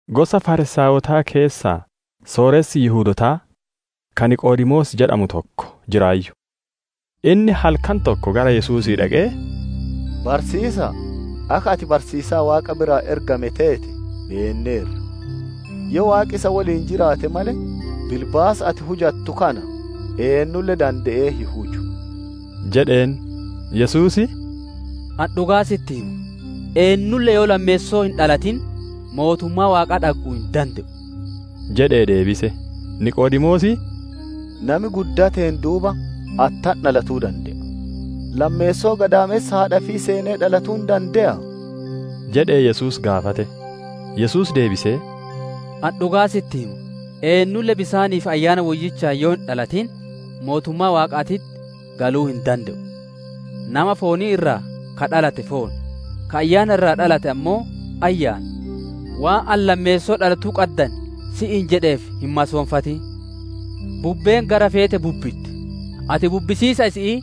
Gosa Fariisaayotaa keessaa sooressi Yihudootaa, ka Niqoodemoos jedhamu tokko jiraayyu. Inni halkan tokko gara Yesuusii dhaqee, «Barsiisa'a, akka ati barsiisaa Waaqa biraa ergame teete beenneerra. Yoo Waaqi isa woliin jiraate malee bilbaasa ati hujattu kana eennulle dande'ee hin huju» jedheen. Yesuus, «Ani dhugaa sitti hima; eennulle yoo lammeessoo hin dhalatin mootummaa Waaqaa dhagguu hin dande'u» jedhee deebise. Niqoodemoos, «Nami guddateen duuba attam dhalatuu dande'a? Lammeessoo gadaamessa haadha ifii seenee dhalatuu hin dande'aa?» jedhee Yesuus gaafate. Yesuus deebisee, «Ani dhugaa sitti hima, eennulle bisaanii fi Ayyaana Woyyichaan yoo hin dhalatin, mootummaa Waaqaatitti galuu hin dande'u. Nama foonii irraa ka dhalate foon; ka Ayyaana irraa dhalate ammoo Ayyaana. Waan ani, ‹Lammeessoo dhalatuu qaddan› si'iin jedheef hin masoonfatin. Bubbeen gara feete bubbitti; ati bubbisiisa isi'ii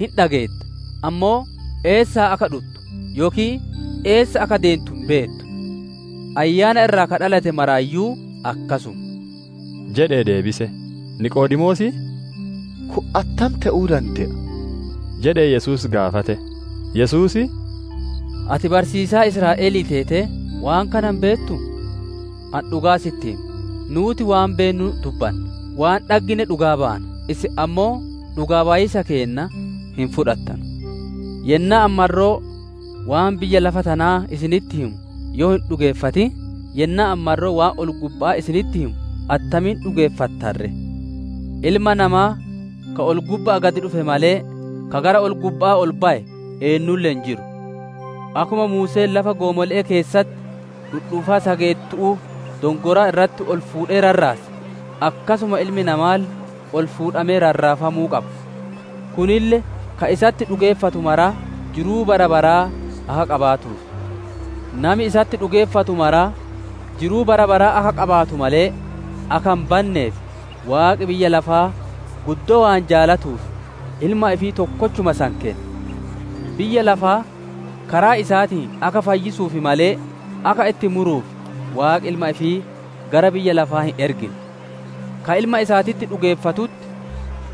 hin dhageetta, ammoo eessaa akka dhuttu yookiin eessa akka deentu hin beettu. Ayyaana irraa ka dhalate maraayyuu akkasuma» jedhee deebise. Niqoodemoos, «Kun attam te'uu dande'a?» jedhee Yesuus gaafate. Yesuus, «Ati barsiisaa Israa'elii teetee waan kana hin beettuu? Ani dhugaa si'itti hima: Nuuti waan beennu dubbanna; waan dhaggine dhugaa baana; isin ammoo dhugaa bayiisa keenna hin fudhattanu. Yennaa ani marroo waan biyya lafa tanaa isinitti himu yoo hin dhugeeffatin, yennaa ani marroo waan ol-gubba'aa isinitti himu attamiin dhugeeffattan ree? Ilma Namaa ka ol-gubba'aa gad dhufe malee, ka gara ol-gubba'aa ol baye eennulle hin jiru. «Akkuma Muuseen lafa goomole'ee keessatti dhudhuufaa sageettu'uu dongoraa irratti ol fuudhe rarraase, akkasuma Ilmi Namaalle ol fuudhamee rarraafamuu qaba. Kunille ka isatti dhugeeffatu maraa jiruu bara baraa akka qabaatuuf. Nami isatti dhugeeffatu maraa jiruu bara baraa akka qabaatu malee akka hin banneef, Waaqi biyya lafaa guddoo waan jaalatuuf Ilma ifii tokkochuma san kenne. Biyya lafaa karaa isaatiin akka fayyisuuf malee, akka itti muruuf Waaqi Ilma ifii gara biyya lafaa hin ergine. «Ka Ilma isaatitti dhugeeffatutti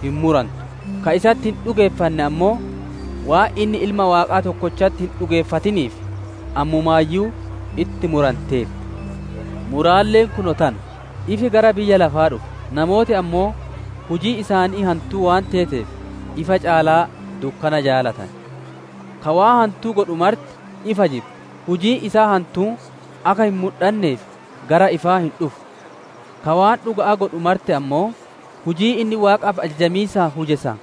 hin murantu; ka isatti hin dhugeeffanne ammoo, waan inni Ilma Waaqaa tokkochatti hin dhugeeffatiniif, ammumaayyuu itti muranteerti. Muraalleen kunoo tana: Ifi gara biyya lafaa dhufe, namooti ammoo hujiin isaanii hantuu waan teeteef, ifa caalaa dukkana jaalatane. Ka waan hantuu godhu marti ifa jibba; hujiin isaa hantuun akka hin mudhanneef gara ifaa hin dhufu. Ka waan dhuga'aa godhu marti ammoo hujiin inni Waaqaaf ajajamiisaan huje san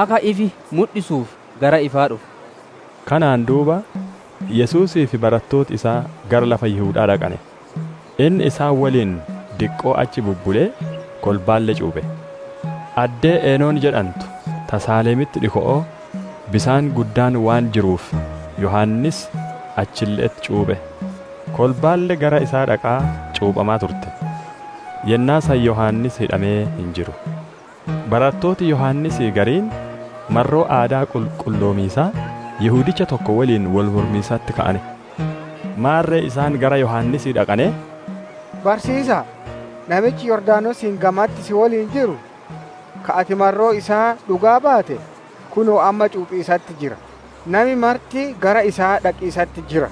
akka ifi mudhisuuf gara ifaa dhufa» jedheen. Kanaan duuba Yesuusii fi barattooti isaa gara lafa Yihuda'aa dhaqane; inni isaan woliin diqqoo achi bubbulee, kolbaalle cuuphe. Addee Enon jedhantu ta Saalemitti dhiko'oo, bisaan guddaan waan jiruuf Yohaannis achille'etti cuuphe. Kolbaalle gara isaa dhaqaa cuuphamaa turte. Yennaa san Yohaannis hidhamee hin jiru. Barattooti Yohaannisii gariin marroo aadaa qulqulloomiisaa Yihudicha tokko woliin wol mormiisatti ka'ane. Maarre isaan gara Yohaannisii dhaqanee, «Barsiisa'a, namichi Yordaanosiin gamatti si woliin jiru, ka ati marroo isaa dhugaa baate, kunoo amma cuuphiisatti jira; nami marti gara isaa dhaqiisatti jira!»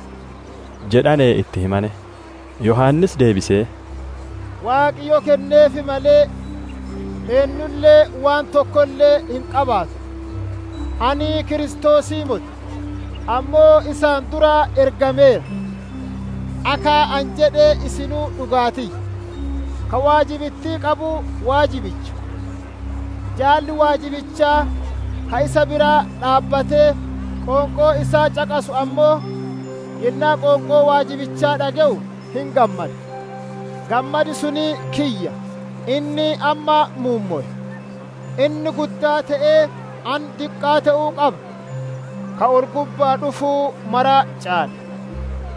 jedhanee itti himane. Yohaannis deebisee, «Waaqi yoo kenneef malee, eennulle waan tokkolle hin qabaatu. ‹Ani Kiristoosii moti; ammoo isaan dura ergameeraa› akka ani jedhe isinuu dhugaa tiyya. Ka waajibittii qabu waajibicha; jaalli waajibichaa, ka isa bira dhaabbatee qoonqoo isaa caqasu ammoo, yennaa qoonqoo waajibichaa dhage'u hin gammada. Gammadi sun kiyya; inni amma muummowe. Inni guddaa te'ee, ani diqqaa te'uu qaba. «Ka ol-gubba'aa dhufu mara caala.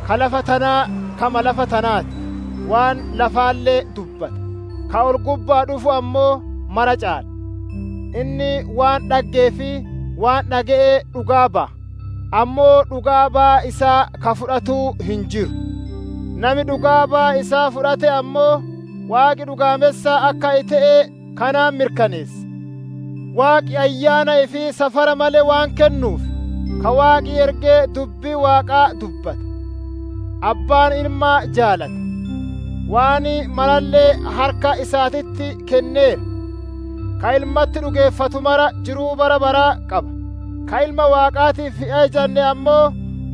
Ka lafa tanaa kama lafa tanaa ti; waan lafaalle dubbata; ka ol-gubba'aa dhufu ammoo mara caala. Inni waan dhaggee fi waan dhage'e dhugaa baya; ammoo dhugaa baya isaa ka fudhatu hin jiru. Nami dhugaa baya isaa fudhate ammoo, Waaqi dhugaammessa akka te'e kanaan mirkaneesse. Waaqi Ayyaana ifii safara male waan kennuuf, ka Waaqi erge dubbii Waaqaa dubbata. Abbaan Ilma jaalata; waan maralle harka isaatitti kenneera. Ka Ilmatti dhugeeffatu mara jiruu bara baraa qaba; ka Ilma Waaqaatiif hin ajajanne ammoo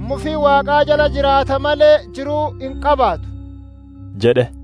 mufii Waaqaa jala jiraata malee, jiruu hin qabaatu» jedhe.